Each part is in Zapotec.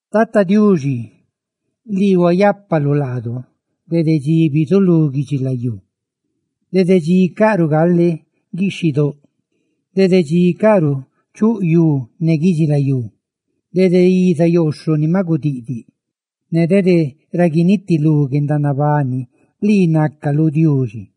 Tata Diuxi, lii huayápaluꞌ laadudede dxi bizulú guidxilayú. Dede dxi caꞌruꞌ gale guixhidóꞌ dede dxi caꞌruꞌ chuꞌ yú ne guidxilayú, dede iza yooxhoꞌ ni maꞌ gudiꞌdiꞌ ne dede ra guinitilú guendanabani, lii nácaluꞌ Diuxi.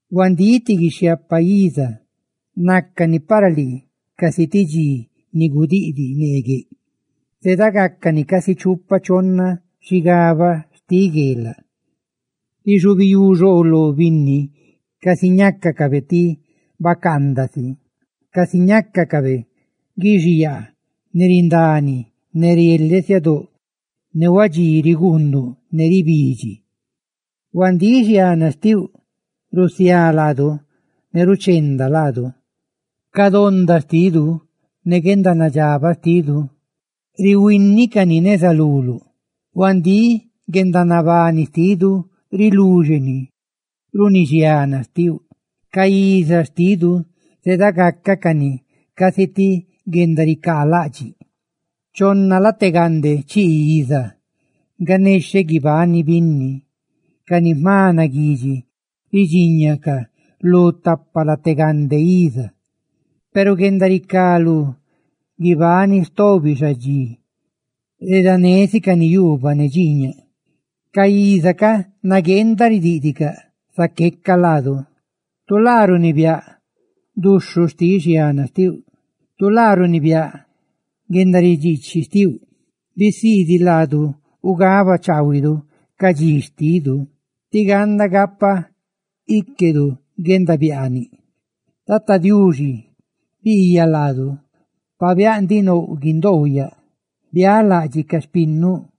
Huandíꞌ, ti guixhiaapa iza, nácani para lii, casi naca dxi xtiꞌ neegueꞌ, ma gudiꞌdiꞌ. ¡Zedagácacani casi chupa chonna xigaba xtiꞌ gueelaꞌ! Rixubiyú xooloꞌ ca binni, casi ñácacaꞌ ti bacaandaꞌ si; casi ñácacaꞌ guixiyaa, ni rindani ne rieleꞌ siadóꞌ, ne huadxí riguunduꞌ ne ribidxi. Huandíꞌ, xiana xtiuꞌ rusiá laadu, ¡ruchenda ni laadu! Ca xtóndadu ne guendanadxabaꞌ xtidu rihuini cani neza luluꞌ. Huandíꞌ, guendanabani xtidu riluxeni runi guendaridxiichi xtiuꞌ; ca iza xtidu zedagácacani casi ti guendaricaalaꞌdxiꞌ. Chonna late gande chii iza si nga nexheꞌ guibani binni; ca ni jma naguidxi ridxiñacaꞌ lu tapa late gande iza; peru guendaricá lú guibani tobi xadxi yuubaꞌ ne dxiiñaꞌ si nga redanécani. ¡Ca iza ca nagueenda ridíꞌdicaꞌ, zaqueca laadu! Tu laa runibiáꞌ duxhuꞌ xtiꞌ xiana xtiuꞌ. Tu laa runibiáꞌ guendaridxiichi xtiuꞌ. Bisiidiꞌ laadu ugabaꞌ chaahuidu ca dxi xtidu, tí ganda guizaa chaahuiꞌ xpiaanidu. ¡Tata Diuxi, Biiyaꞌ laadu! Pabiáꞌ ndiꞌ nouꞌ guindoou yaꞌ. ¡Bialaꞌdxiꞌ ca xpinnuꞌ!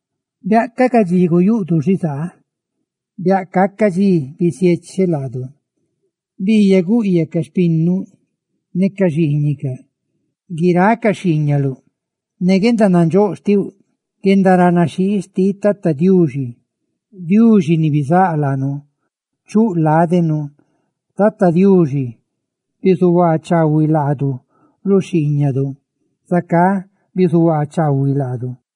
Biaꞌca ca dxi guyuꞌdu xizaa biáꞌ caca dxi bisiecheꞌ laadu. ¡Biiyaꞌ guꞌyaꞌ ca xpinnuꞌ ne ca xiiñicaꞌ guiráꞌ ca xhiiñaluꞌ ne guendanandxóꞌ xtiuꞌ! Guendaranaxhii xtiꞌ Tata Diuxi, Diuxi ni bizáꞌ laanu, chuꞌ ládenu. ¡Tata Diuxi, bizuhuaa chaahuiꞌ laadu, lu xhiiñadu! ¡Bizuhuaa chaahuiꞌ, zacá, xhiiñadu!